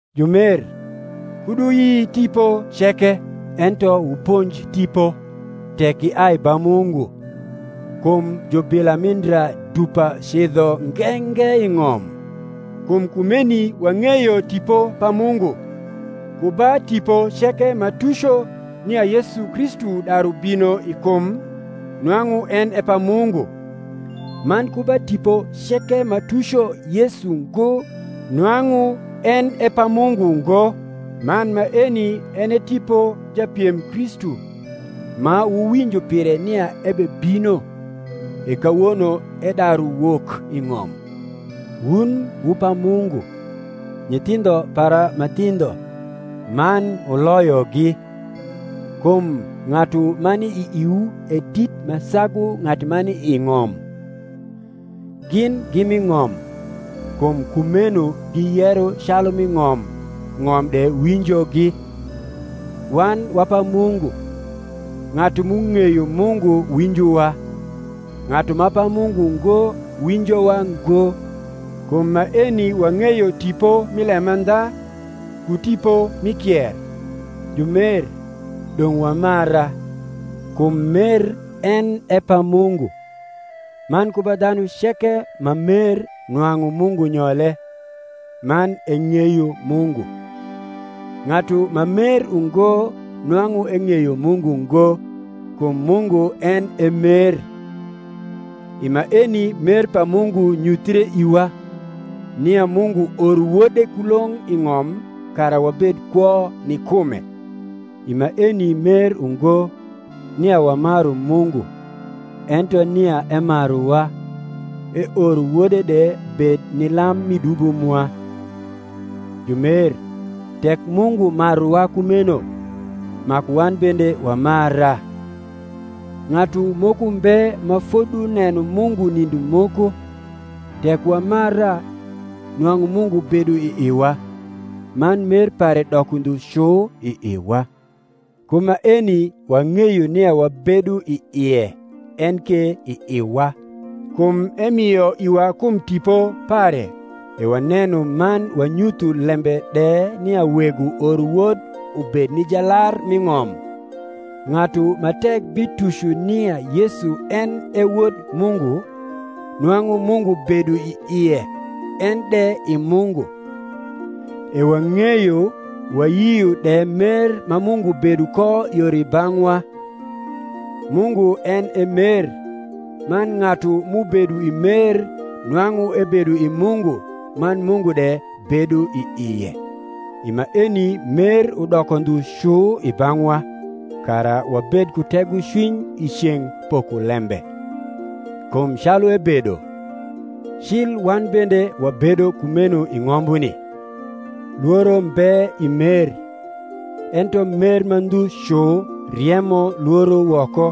Jumer, kud wuyi tipo ceke, ento wuponj tipo, tek giai ba Mungu, kum jubila mi ndra dupa cidho nge nge i ng’om. Kum kumeni waug’eyo Tipo pa Mungu: ku ba tipo ceke ma tuco nia Yesu Kristu daru bino i kum nwang’u en e pa Mungu: man ku ba tipo ceke ma tuco Yesu ngo nwang’u en e pa Mungu ngo: man maeni en e tipo japiem Kristu, ma wuwinjo pire nia ebebino; e kawono edaru wok i ng’om. Wun wu pa Mungu, nyithindho para ma thindho, man wuloyogi: kum ng’atu ma ni i iwu e dit ma sagu ng’atu ma ni i ng’om. Gin gi mi ng’om: kum kumeuo giyero calu mi ng’om, ng’om de winjog. Wan wa pa Mungu: ng’atu m’ung’eyo Mungu winjowa; ng’atu ma pa Mungu ngo winjowa ngo. Kum maeni wang’eyo tipo mi lemandha, ku tipo mi kier. Jumer, dong’ wamara, kum mer en e pa Mungu; man ku ba dhanu ceke ma mer nwang’u Mungu nyole, man eng’eyo Mungu. Ng’atu ma mer ungo nwang’u eng’eyo Mungu ngo; kum Mungu en e mer. I maeni mer pa Mungu nyuthre iwa, nia Mungu oro Wode kulong’ i ng’om kara wabed kwo ni kume. I maeni mer ungo, nia wamaru Mungu, ento nia emaruwa, eoro wode de bed ni lam mi dubo mwa. Jumer, tek Mungu maruwa kumeno. maku wan bende wamara. Ng’atu moko mbe ma foduneno Mungu nindo moko: tek wamara, nwang’u Mungu bedo i iwa. man mer pare doko ndhu cu i iwa: ku maeni wang’eyo nia wabedo i ie en ke i iwa, kum emio iwa kum Tipo pare. E waneno man wanyutho lembe de nia Wego oro Wod ubed ni Jalar mi ng’om. Ng’atu ma tek bituco nia Yesu en e Wod Mungu, nwang’u Mungu bedo i ie, en de i Mungu. E wang’eyo wayio de mer ma Mungu bedo ko yor i bang’wa. Mungu en e mer; man ng’atu m’ubedo i mer nwang’u ebedo i Mungu, man Mungu de bedo i ie. I maeni mer udoko ndhu cu i bang’wa, kara wabed ku tegocwiny i ceng’ pokolembe; kum calu ebedo, cil wan bende wabedo kumeno i ng’ombuni. Lworo mbe i mer: ento mer ma ndhu cu riemo lworo woko,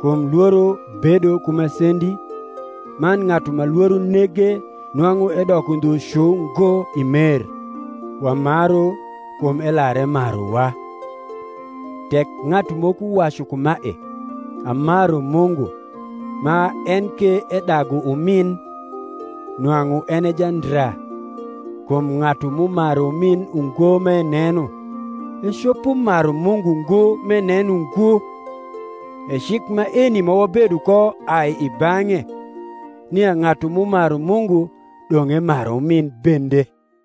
kum lworo bedo ku masendi; man ng’atu ma lworo nege nwang’u edoko ndhu cu ngo i mer. Wamaru, kum elar emaruwa. Tek ng’atu moko wacu kumae, Amaru Mungu, ma en ke edagu umiu, nwang’u en e jandra: kum ng’atu m’umaru umin ungo m’eneno, ecopo maru Mungu ngo m’eneno ngo. E cik maeni ma wabedo ko ai i bang’e, nia ng’atu m’umaru Mungu dong’ emar umin bende.